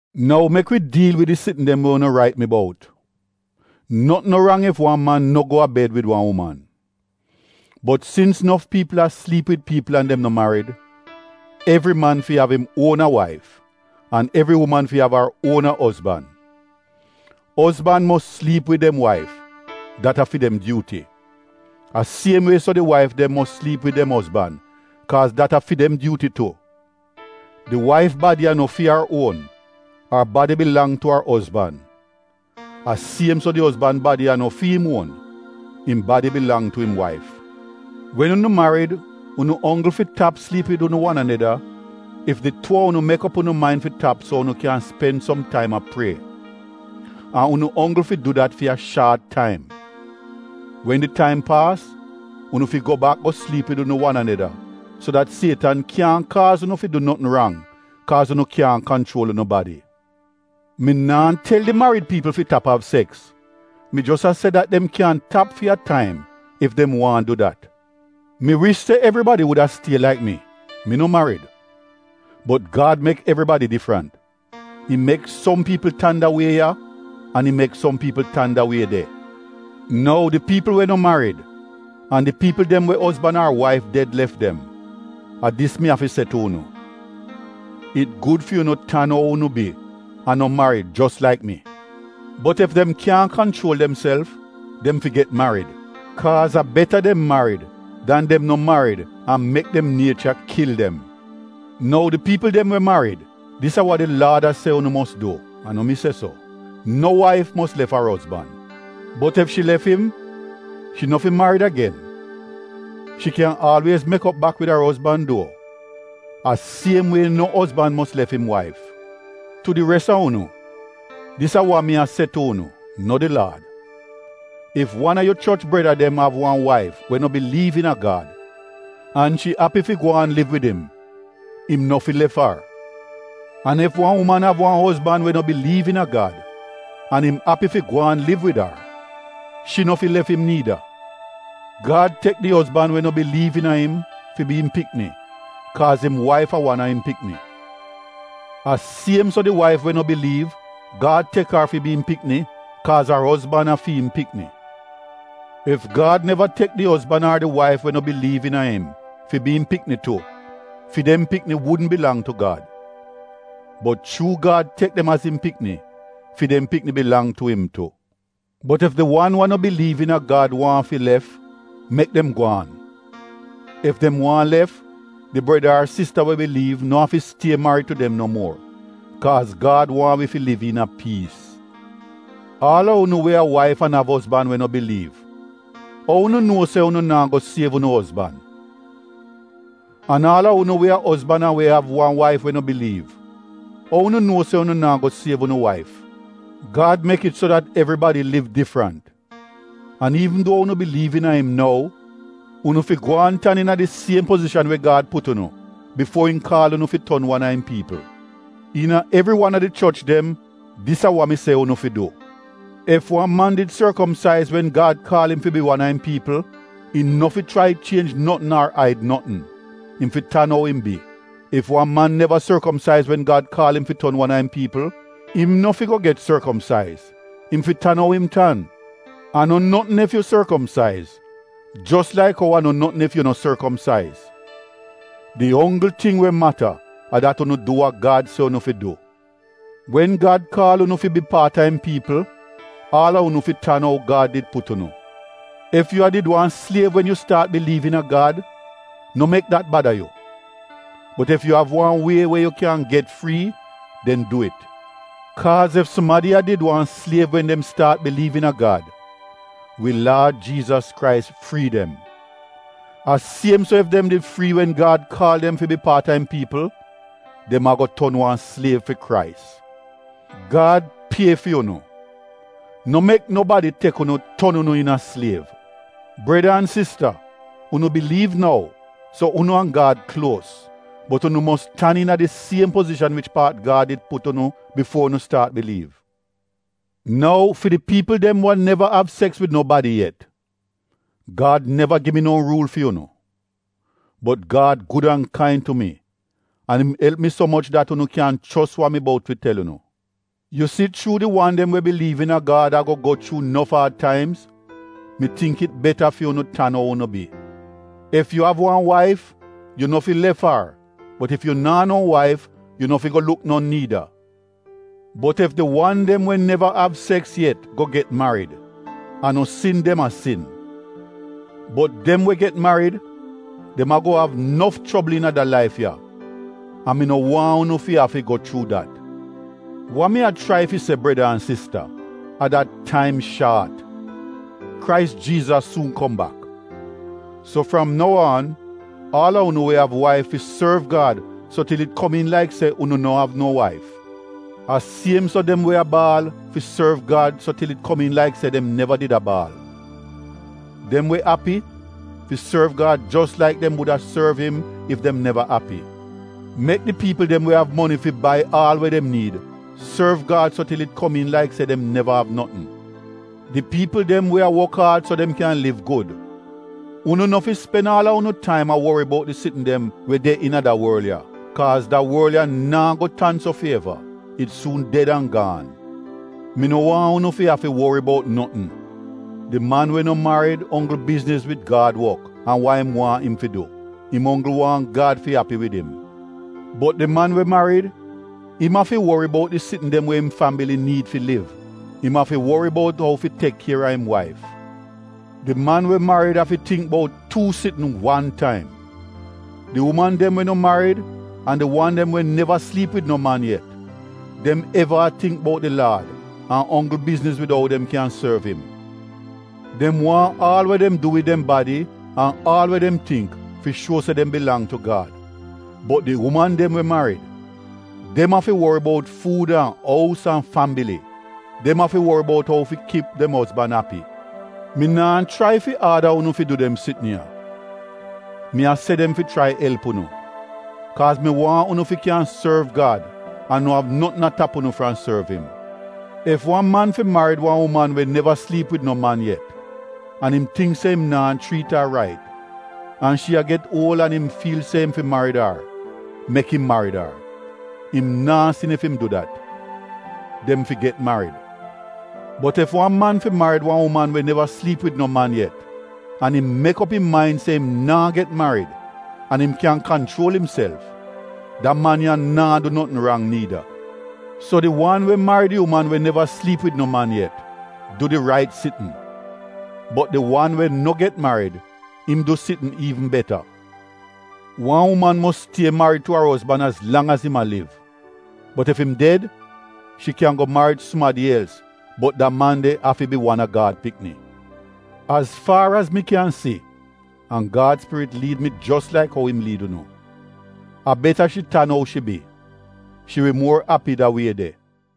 Nou mek mi diil wid di sitn dem we unu rait mi bout: notn no rang ef wan man no go a bed wid wan uman. Bot sins nof piipl a sliip wid piipl an dem no marid, evri man fi av im uona waif, an evri uman fi av ar uona ozban. Ozban mos sliip wid dem waif, dat a fi dem dyuuti. A siem wie so di waif dem mos sliip wid dem ozban kaaz dat a fi dem dyuuti tu. Di waif badi a no fi ar uon, ar badi bilang tu ar ozban. A siem so di ozban badi a no fi im uon, im badi bilang tu im waif. Wen unu marid unu onggl fi tap sliip wid unu wan aneda ef di tuu a unu mek op unu main fi tap so unu kyan spen som taim a prie. An unu onggl fi du dat fi a shaat taim. Wen di taim paas unu fi go bak go sliip wid unu wan aneda so dat Sietan kyaahn kaaz unu fi du notn rang kaaz unu kyaahn kanchuol unu badi. Mi naa tel di marid piipl fi tap av seks mi jos a se dat dem kyan tap fi a taim ef dem waahn du dat. Mi wish se evribadi wuda stie laik mi — mi no marid. Bot Gad mek evribadi difrant, im mek som piipl tan da wie ya an im mek som piipl tan da wie de. Nou di piipl we no marid an di piipl dem we ozban ar waif ded lef dem, a dis mi afi se tu unu: it gud fi unu tan ou unu bi an no marid jos laik mi. Bot ef dem kyaahn kanchuol demself, dem fi get marid. Kaaz a beta dem marid dan dem no marid an mek dem niecha kil dem. Nou di piipl dem we marid dis a wa di Laad a se unu mos du, a no mi se so: No waif mos lef ar ozban. Bot ef shi lef im, shi no fi marid agen, shi kyan aalwiez mek op bak wid ar ozban duo. A siem wie no ozban mos lef im waif. Tu di res a unu, dis a wa mi a se tu unu, no di laad: Ef wan a yu choch breda dem av wan waif we no biliiv iina Gad, an shi api fi gwaan liv wid im, im no fi lef ar. An ef wan uman av wan ozban we no biliiv iina Gad, an im api fi gwaan liv wid ar, shi no fi lef im niida. Gad tek di ozban we no biliiv iina im fi bi im pikni kaaz im waif a wan a im pikni. A siem so di waif we no biliiv, Gad tek ar fi bi im pikni kaaz ar ozban a fi im pikni. Ef Gad neva tek di ozban ar di waif we no biliiv iina im fi bi im pikni tu, fi dem pikni wudn bilang tu Gad. Bot chuu Gad tek dem az im pikni, fi dem pikni bilang tu im tu. Bot ef di wan we a no biliiv iina Gad waahn fi lef, mek dem gwaan. Ef dem waahn lef, di breda ar sista we biliiv no afi stie marid tu dem no muor. Kaaz Gad waahn wi fi liv iina piis. Aal a unu we a waif an av ozban we a no biliiv, ou unu nuo se unu naa go siev unu ozban? An aal a unu we a ozban an we av wan waif we no biliiv, ou unu nuo se unu naa go siev unu waif? Gad mek it so dat evribadi liv difrant an iivn duo unu biliiv iina im nou, unu fi gwaan tan iina di siem pozishan we Gad put unu bifuo im kaal unu fi ton wan a im piipl. Iina evri wan a di choch dem dis a wa mi se unu fi du. Ef wan man did sorkomsaiz wen Gad kaal im fi bi wan a im piipl, im no fi chrai chienj notn ar aid notn, im fi tan ou im bi. Ef wan man neva sorkomsaiz wen Gad kaal im fi ton wan a im piipl, im no fi go get sorkomsaiz, im fi tan ou im tan. A no notn ef yu sorkomsaiz jos laik ou a no notn ef yu no sorkomsaiz. Di onggl ting we mata a dat unu du wa Gad se unu fi du. Wen Gad kaal unu fi bi paat a im piipl, aal a unu fi tan ou Gad did put unu. Ef yu a did wan sliev wen yu staat biliiv iina Gad, no mek dat bada yu. Bot ef yu av wan wie we yu kyan get frii, den du it. Kaaz ef sumadi a did wan sliev wen dem staat biliiv iina Gad, wi Laad Jiizas Krais frii dem. A siem so ef dem did frii wen Gad kaal dem fi bi paat a im piipl, dem ago ton wan sliev fi Krais. Gad pie fi unu, no mek nobadi tek unu ton unu iina sliev. Breda an sista unu biliiv nou, so unu an Gad kluos. Bot unu mos tan iina di siem pozishan wich paat Gad did put unu bifuo unu staat biliiv. Nou fi di piipl dem we neva av seks wid nobadi yet, Gad neva gi mi no ruul fi unu. Bot Gad gud an kain tu mi an im elp mi so moch dat unu kyan chos wa mi bout fi tel unu. Yu si chuu di wan dem we biliiv iina Gad ago go chuu nof aad taimz, mi tingk it beta fi unu tan ou unu bi. Ef yu av wan waif, yu no fi lef ar bot ef yu naa no waif, yu no fi go luk non niida. Bot ef di wan dem we neva av seks yet go get marid a no sin dem a sin. Bot dem we get marid, dem ago av nof chobl iina da laif ya an mi no waahn unu fi afi go chuu dat. Wa mi a chrai fi se breda an sista, a dat taim shaat — Krais Jiizas suun kom bak. So fram nou aan, aal a unu we av waif fi sorv Gad so til it komiin laik se unu no av no waif. A siem so dem we a baal, fi sorv Gad so til it komiin laik se dem neva did a baal. Dem we api, fi sorv Gad jos laik dem wuda sorv im ef dem neva api. Mek di piipl dem we av moni fi bai aal we dem niid, sorv Gad so til it komiin laik se dem neva av notn. Di piipl dem we a wok aad so dem kyan liv gud, unu no fi spen aal a unu taim a wori bout di sitn dem we de iina da worl ya. Kaaz da worl ya naa go tan so fi eva — it suun ded an gaan. Mi no waahn unu fi afi wori bout notn. Di man we no marid onggl bizniz wid Gad wok an wa im waahn im fi du. Im onggl waahn Gad fi api wid im. Bot di man we marid im afi wori bout di sitn dem we im fambili niid fi liv. Im afi wori bout ou fi tek kier a im waif. Di man we marid afi tingk bout tuu sitn wan taim. Di uman dem we no marid an di wan dem we neva sliip wid no man yet, dem eva a tingk bout di Laad an onggl bizniz wid ou dem kyan sorv im. Dem waahn aal we dem du wid dem badi an aal we dem tingk fi shuo se dem bilang tu Gad. Bot di uman dem we marid, dem afi wori bout fuud an ous an fambili — dem afi fi wori bout ou fi kip dem ozban api. Mi naa chrai fi aada unu fi du dem sitn ya. Mi a se dem fi chrai elp unu, kaaz mi waahn unu fi kyan sorv Gad an no av notn a tap unu fram sorv im. Ef wan man fi marid wan uman we neva sliip wid no man yet an im tingk se im naa chriit ar rait, an shi a get uol an im fiil se im fi marid ar — mek im marid ar. Im naa sin ef im im du dat. Dem fi get marid. Bot ef wan man fi marid wan uman we neva sliip wid no man yet, an im mek op im main se im naa get marid, an im kyan kanchuol imself — da man ya naa du notn rang niida. So di wan we marid di uman we neva sliip wid no man yet, du di rait sitn, bot di wan we no get marid — im du sitn iivn beta. Wan uman mos stie marid tu ar ozban az lang az im a liv. Bot ef im ded shi kyan go marid sumadi els bot da man de afi bi wan a Gad pikni. Az faar az mi kyan si an Gad spirit liid mi jos laik ou im liid unu — a beta shi tan ou shi bi, shi wi muor api da wie de.